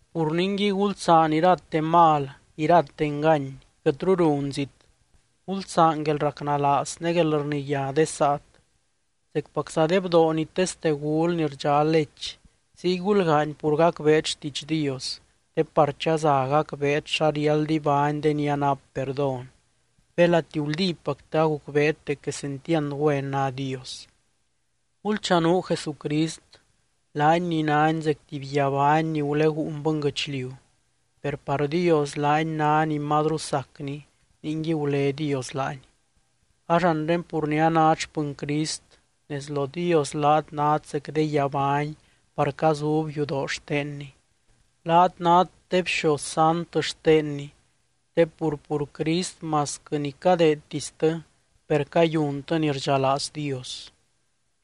Pur ningui, gulsaan irate mal, irate engany, quɨtru runzit. Gulsaan guelracnalaaz ne guelrniyá de saat. Zecpacza de bdoo ni teste gul ni rdxá lech, ziy gulgaany pur gacbeet xtiidx Dios, te par chaza gacbeet xa riáld ibány de ni anap perdón, belati guldípactɨ agucbeet dec quesentiand güen ná Dios. Gulchanuu Jesucrist, laany ni nány zec tuby guiabány ni guleguun bɨnguɨchliu, per par Dios laany ná ni mazru sacny ningui gulé Dios laany. Ax anre pur ni anát xpɨny Crist, nez lo Dios laat nát zec de guiabány par cazub yudoo xtenny, laat nát de bxoz sant xtenny te pur, pur Crist masquɨ ni cadeedtistɨ per cayuntɨ ni rdxalaaz Dios.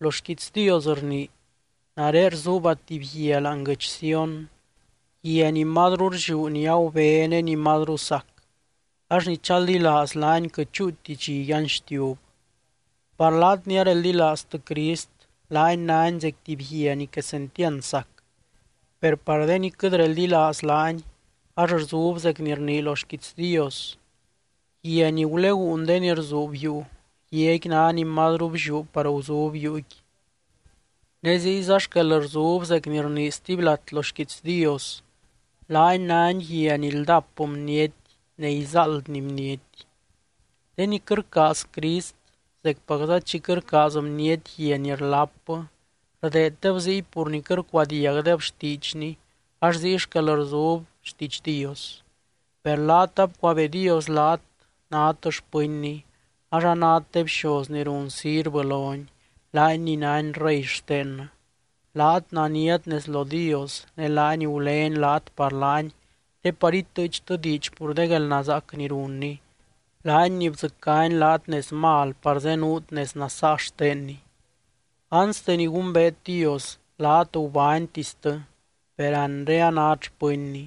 Lo xquiits Dios rnii: Nare rzuubba tuby guia láani guɨdx Sión, guia ni mazru rlliú ni agubé ne ni mazru sac, ax ni chaldilaaz laany quɨt chúuti dxi yanxtiub. Par laat ni areldilaaztɨ Crist, laany nány zec tuby guia ni quesentiand sac. Per par de ni quɨt reldilaaz laany ax rzub zec ni rnii lo xquiits Dios: Guia ni guleguun de ni rzuub yuu, guiaqui ná ni mazru blliú par guzub yuuqui. Ne ziyza xquel rzub zec ni rnii stuby lat lo xquiits Dios: Laany nány guia ni ldap bniety ne izáaldny bniety. De ni quɨt rcaaz Crist zecpacza chi quɨt rcaaz bniety guia ni rlapbɨ, rdeeddeb ziy pur ni quɨt rcuadiagdeb xtiidxny ax ziy xquel rzub xtiidx Dios. Per laat abcuabee Dios laat nát xpɨnny, ax anát de bxoz ni run sirvɨ lony, laany ni nány rey xtennɨ. Laat naniat nez lo Dios ne laany gulény laat par laany te par itɨɨchtɨ diidx pur de guelnazaac ni runny, laany ni bdzɨcány laat nez mal par zenuut nez nasaa xtenny. Anste ni gumbeet Dios laat gubánytistɨ per anre anát xpɨnny,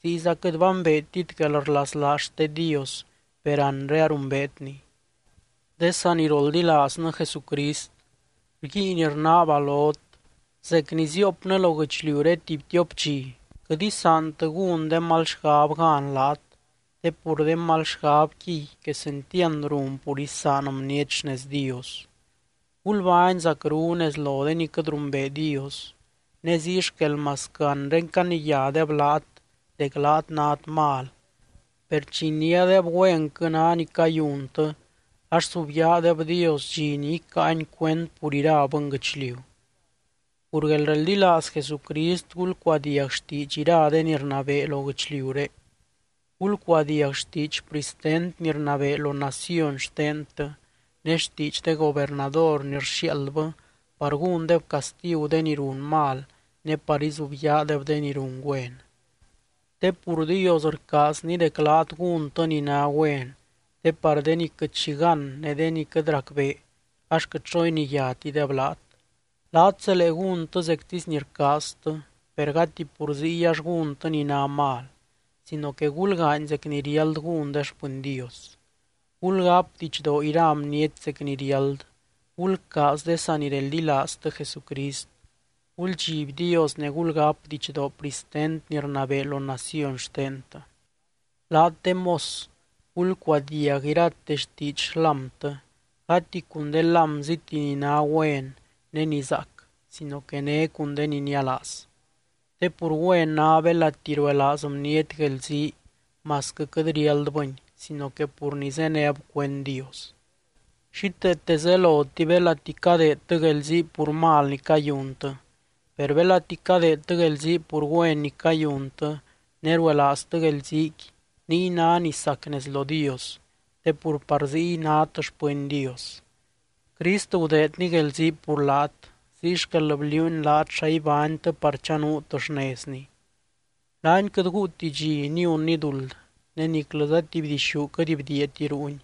ziyza quɨt bambeetit guelrlaslaaz xte Dios per anre arumbeetni. De saniroldilaaznɨ Jesucrist, rguiin rnaaba lot, zec ni ziiopnɨ lo guɨchliuré tuby tiop dxi, quɨt isaantɨ gún de mal xgab gan laat te pur de mal xgabquiy quesentiand run pur isaan bniety xnez Dios. Gulbány zacru nez lo de ni quɨt rumbee Dios. Ne ziy xquel masquɨ anre caniyádeb laat dec laat nát mal, per chi iniádeb güenquɨ ná ni cayuntɨ ax subyaadeb Dios dxi ni icáany cuend pur ira bɨnguɨchliu. Pur guelreldilaaz Jesucrist, gulcuadiag xtiidx ira de ni rnabee lo guɨchliuré. Gulcuadiag xtiidx pristent ni rnabee lo naciony xtentɨ ne xtiidx de gobernador ni rxiaaldbɨ par gúndeb castigu de ni run mal, ne par izubyaadeb de ni run güen. Te pur Dios rcaazny dec laat gúntɨ ni ná güen, te par de ni quɨt xi gán ne de ni quɨt racbee ax quɨt xo iniyátideb laat. Laat zelee gúntɨ zectisy ni rcaaztɨ, per gati pur ziy ax gúntɨ ni ná mal sino que gulgaany zec ni riáld gún de xpɨny Dios. Gulgáp didxdoo ira bniety zec ni riáld. Gulcaaz de sanireldilaaztɨ Jesucrist, guldxiby Dios ne gulgáp didxdoo pristent ni rnabee lo naciony xtentɨ. Laat de mos gulcuadiag irate xtiidx xlámtɨ, gati cun de lámziti ni ná güen ne ni zaac sino que né cun de ni nialaaz. Te pur güen ná belati ruelaaz bniety guelzii masquɨ quɨt riáldbɨni sino que pur ni zéneb cuend Dios. Xíteete zeloti belati cadeedtɨ guelzii pur mal ni cayuntɨ. Per belati cadeedtɨ guelzii pur güen ni cayuntɨ ne ruelaaztɨ guelziiqui, niy ná ni sac nez lo Dios te pur par ziy nát xpɨny Dios. Crist gudeedny guelzii pur laat, ziy xquel bliuuny laat xa ibánytɨ par chanuut xnezny. Laany quɨt guuti dxi niunny duld ne niclɨza tuby dixú quɨt bdiiati ruuny.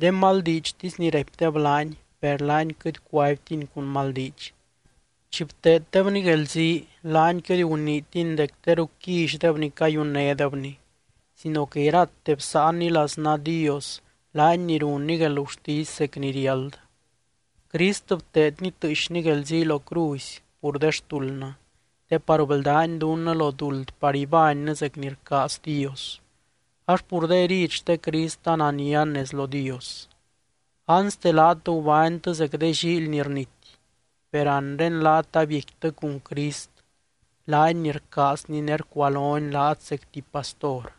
De maldiidxtisy ni raipdeb laany, per laany quɨt cuaibtiny cun mal diidx. Chi bteeddebny guelzii, laany quɨt guniitiny dec teru quillydeb ni cayunnédebny sino que irate bsáanny laznaa Dios, laany ni runny guelgurtisy zec ni riáld. Crist bteedny tɨɨxny guelzii lo cruzy pur de xtuldnɨ te par bldány dunnɨ lo duld par ibánnɨ zec ni rcaaz Dios, ax pur de herid xte Crist ananian nez lo Dios. Anste, laat gubánytɨ zec de llíily ni rnity, per anre laat abiecquitɨ cun Crist, laany ni rcaazny ne rcualony laat zec tuby pastor.